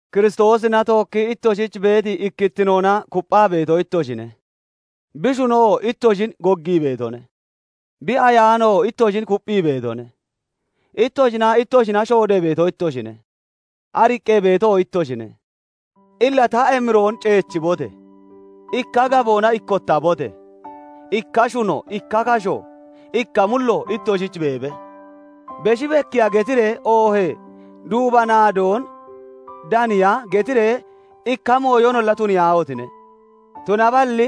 Kiristoosina tookkii ittoshich beeti ikkittinoona kupphaa beeto ittoshine; bi shunoo ittoshin goggii beetone; bi Ayaanoo ittoshin kupphii beetone; ittoshinaa ittoshina shoodee beeto ittoshine; ariqqee beetoo ittoshine. Illa ta emiroon ceechibote! Ikka gaboona ikkottabote! Ikka shuno, ikka kasho, ikka mullo ittoshich beebe. Beshi bekkiya getiree oohee duuba naadoon daniya getiree ikka mooyonolla tuniyaahotine! Tunaballi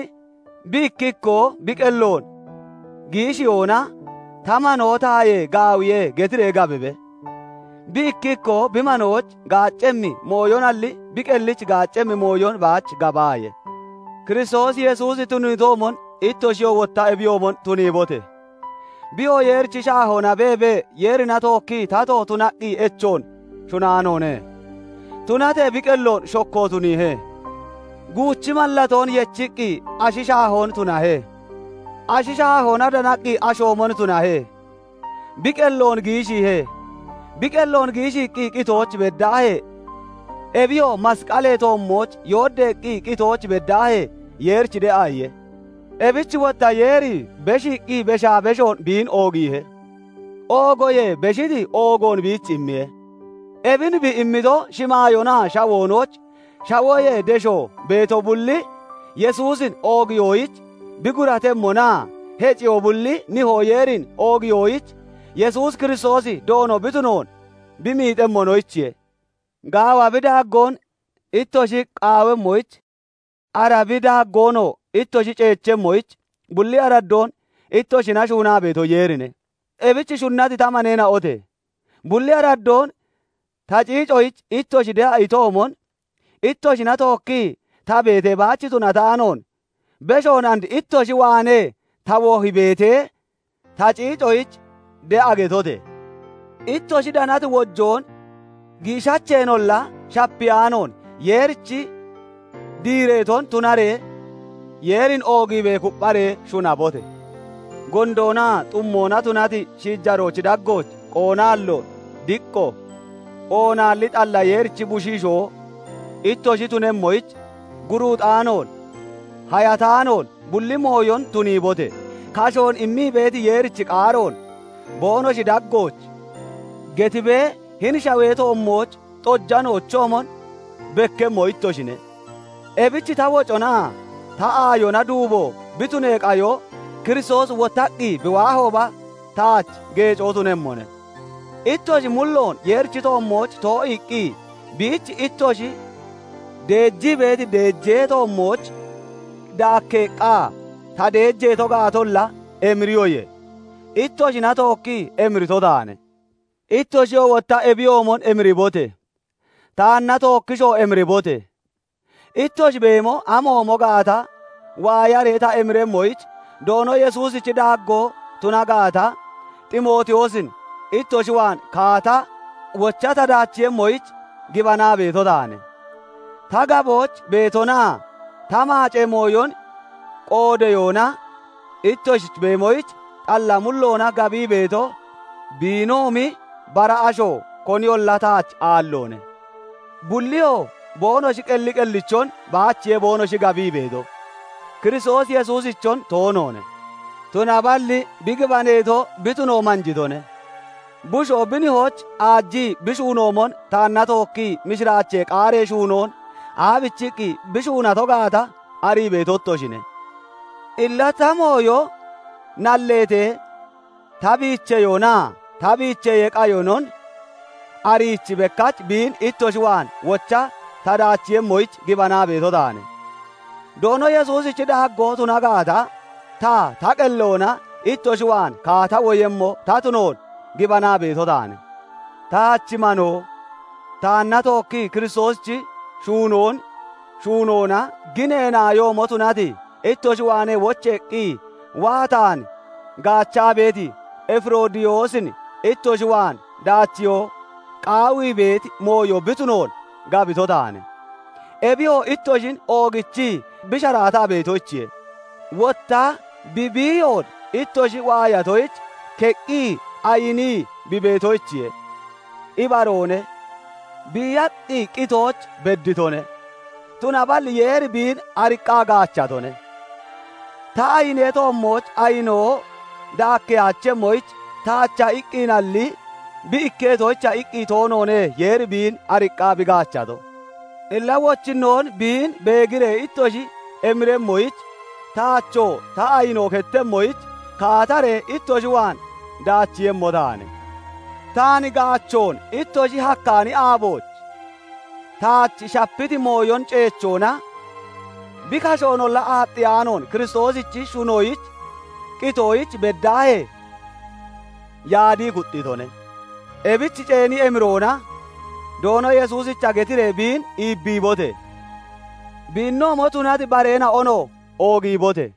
bi ikki ikkoo bi qelloon giishiyoona "Ta manoo tayee gaawiye" getiree gabibe. Bi ikki ikkoo bi manoyich gaaccemmi mooyonalli bi qellich gaaccemmi mooyon baach gabaaye. Kiristoos Yesuusi tuniitoomon ittoshiyoo wotta ebiyoomon tuniibote! Biyoo Yeerichi shaahoona beebee, Yeerina tookkii tato tunaqqi echoon shunaanoone; tunatee bi qelloon shokko tuniihe; guuchi mallatoon yechiqqi ashi shaahoon tunahe. Ashi shaahoona danaqqi ashoomon tunahe; bi qelloon giishiihe; bi qelloon giishiiqqi qitooch beddaahee, ebiyoo masqalee toommooch yooddeeqqi qitooch beddaahee, Yeerich de'a iye. Ebich wotta Yeeri beshiiqqi beshaa beshoon biin oogiihe; oogoyee beshiti oogoon biich immiye; ebin bi immito, shimaayoonaa shawoonooch, shawoyee deshoo beeto bulli Yesuusin oogiyoyich bi guratemmonaa heciyoo bulli Nihoo Yeerin oogiyoyich Yesuus Kiristoosi Doono bi tunoon bi miixemmonoyichiye. Gaawa bi daaggoon ittoshi qaawemmoyich, ara bi daaggoonoo ittoshi ceechemmoyich, bulli araddoon ittoshina shuunaa beeto Yeerine. Ebich shunnati ta maneena'ote! Bulli araddoon ta ciicoyich ittoshi de'a itoomon, ittoshina tookkii ta beetee baach tunataanoon beshoon and ittoshi waanee ta wohi beetee, ta ciicoyich de'a getote! Ittoshi danati wodoon giishacheenolla shapiyaanoon Yeerich diireeton tunaree Yeerin oogiibee kuppharee shuunabote! Gondoona xummoona tunati shiijaroochi daggooch qoonaallo, diqqo, oonaalli xalla Yeerichi bushiishoo ittoshi tunemmoyich, guruuxaanoon, hayataanoon bulli mooyon tuniibote! Kashoon immii beeti Yeerichi qaaroon boonoshi daggooch getibee hini shawee toommooch xojanoochoomon bekkemmo ittoshine. Ebich ta woconaa ta aayona duubo bi tunee qayo Kiristoosi wottaqqi bi waahooba taach geecco tunemmone. Ittoshi mulloon Yeerichi toommooch too'iiqqi biich ittoshi deejii beeti deejee toommooch daakkeeqqa ta deejeeto gaatolla emiriyoye; ittoshina tookkii emirito taane. Ittoshiyoo wotta ebiyoomon emiribote! Taana tookkishoo emiribote! Ittoshi beemo amoomo gaata waayaree ta emiremmoyich, Doono Yesuusichi daaggoo tuna gaata, Ximootiyoosin ittoshi waan kaata wocha ta daachiiyemmoyich gibanaa beeto taane. Ta gabooch beetonaa ta maacee mooyon qoodeyoona ittoshichi beemoyich xalla mulloona gabii beeto biinoomi bara asho koniyolla taach aalloone. Bulliyoo boonoshi qelli qellichon baachiye boonoshi gabii beeto; Kiristoos Yesuusichon toonoone. Tunaballi bi gibaneeto bi tuno manjitone. Bushoo bi nihoyich aajii bi shuunoomon taanna tookkii mishiraachee qaaree shuunoon aabichiqqi bi shuunato gaata arii beeto ittoshine. Illa ta mooyo nalleetee ta biicheyoonaa ta biicheyee qayonon ariichi bekkach biin ittoshi waan wocha ta daachiiyemmoyich gibanaa beeto taane. Doono Yesuusichi daaggoo tuna gaata, ta ta qelloona ittoshi waan kaata woyemmo ta tunoon gibanaa beeto taane. Taach manoo, taanna tookkii Kiristoosichi shuunoon shuunoona ginee naayoomo tunati, ittoshi waanee wocheeqqi waa taan gaachaa beeti Efiroodiyoosin ittoshi waan daachiyo qaawii beeti mooyo bi tunoon gabito taane. Ebiyoo ittoshin oogichii bi sharaataa beetoyichiye; wotta bi biiyoon ittoshi waayatoyich keqqi ayinii bi beetoyichiye. Ibaroone; biiyaqqi qitooch bedditone; tunaballi Yeeri biin ariqqaa gaachatone. Ta ayinee toommooch ayinoo daakkeyaachemmoyich taacha iqqinalli bi ikketoyicha iqqi toonoone Yeeri biin ariqqaa bi gaachato. Illa wochinnoon biin beegiree ittoshi emiremmoyich, taachoo ta ayinoo kettemmoyich, kaataree ittoshi waan daachiiyemmo taane. Taan gaachoon ittoshi hakkaani aabooch taach shapiti mooyon ceechoona bi kashoonolla aaxxiyaanoon Kiristoosichi shuunoyich qitoyich beddaahee yaadii kuxxitone. Ebich ceeni emiroona Doono Yesuusicha getiree biin iibbiibote! Biinoomo tunati bareena'onoo oogiibote!